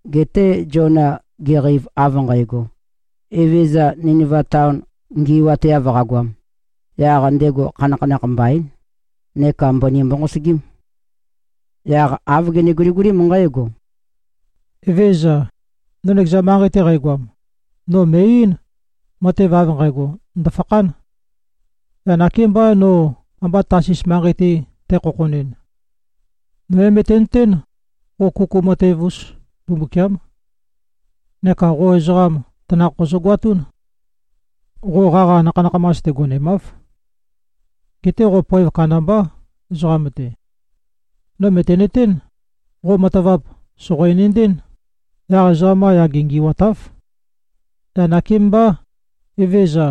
Geté Ziona geqeiv av nqægo, Evezøza Niniva taon ngi꞉wateav qagoam, yaq ndego khanakhanakh mbaín, neka mbøni mbonqosøgím. Yaq āv gene-guligulím nqǽgo, “Evézøza. No nøkeza manqei-te qægoam, no mø̀e-eín, matev av nqægo, ndø̀fakhán. Yaq nakémbá, no amba Tasis manqei-te tækhokhonɨn. No é-møtenøtén, qo kuku matev-us Mbumbukiám. Neka qo ezoqam tanakh qozøgoatún. Qo qaqa nakha-nakhamas-te gonemáv. Geté qo poev kandambá, ezoqam-te. No mø̀tenøtén, qo matavap sòqo-enendɨ́n, yaq ezoqam-qa yage ngi꞉watáv. Yaq nakémbá, Evezøza,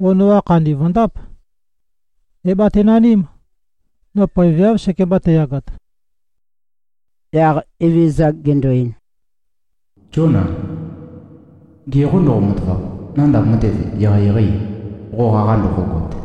qo noqa khandi vø̀ndáp. É-batenaním. No poeveáv sekemba tæyagat.” Yaq Evezøza gendo-ein, “Zíona. Ge qô ndoqo-matavap. Nandav matev eqeieqeî, qo qaqa ndoqogot?”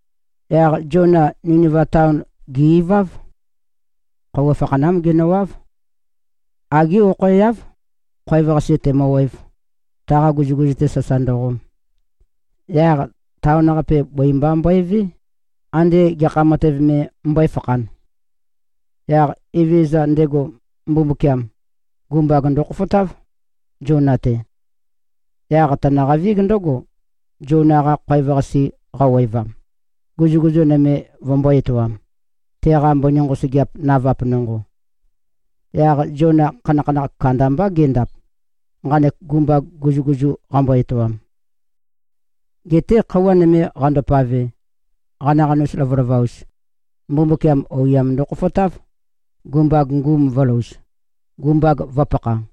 Yaq Ziona Niniva taon gè-iváv. Khøuwa fakhanám genøwáv. Agé okhoeáv, khoev-qase tēmø̄wēv, taqa guzuguzu-te sasa ndøqom. Yaq taon-qape, bøi mba mbøevé, ande gekha matev me mbøéfakhān. Yaq Evezøza, ndego Mbumbukiam, gumbag ndøkhofotáv, Ziona-te. Yaq tønøqavíg ndǿgo, Ziona-qa khoev-qase qawevam, guzuguzu nøme vømbō-etoam, teqa mbøni nqosøgeap navap nonqo. Yaq Ziona khanakhanakh kandambá gendap, nqanek gumbag guzuguzu qambo-etoam. Geté khøuwa nøme qandopave, qanaqanus lovalova-us, Mbumbukiam oiyam ndokhofotáv, gumbag ngum vø̄louz, gumbag vø̄pakha.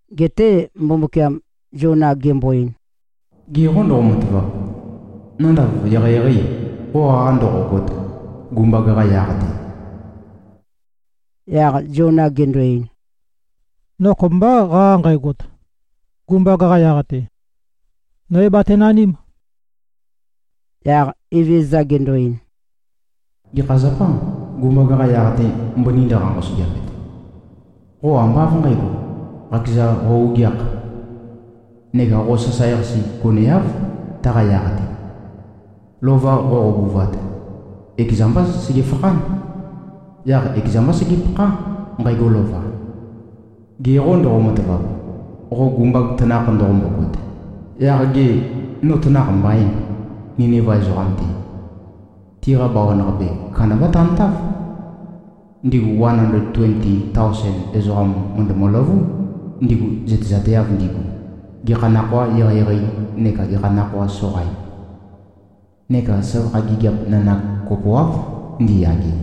Geté Mbumbukiam Ziona gembo-ein, “Ge qô ndoqo-matavap, Nandav eqeieqeî, qo qaqa ndoqogot, gumbag-qa yaq-te?” Yaq Ziona gendo-ein, “No kopømbá qaqa nqægot, gumbag-qa yaq-te. No é-batenaním.” Yaq Evezøza gendo-ein, “Gekha zapâ, gumbag-qa yaq-te mbøni ndøqa-nqosøgeapet? Qo ambá av nqǣgo, qakeza qo-ogeākh. Neka qo sasae-qase goneáv, taqa yaq-te. Lova qoqobuvat, ekeza mbá segefakhán. Yaq ekeza mbá segepakhá, nqægo lova. Ge qô ndoqo-matavap, qo gumbag tanakh ndoqombogot, yaq gê, no tanakh mbaîn, Niniva ezoqam-te? Tiqa bawan-qape, kandambá tantáv. Ndigu wan andled tuenti taosen ezoqam mø̀ndømø-løvú, ndigu zøtezateav ndigu, gekha nakhōa eqeieqei neka gekha nakhōa soqain. Neka søvakha gigiap nanak kopoáv ndiyage.”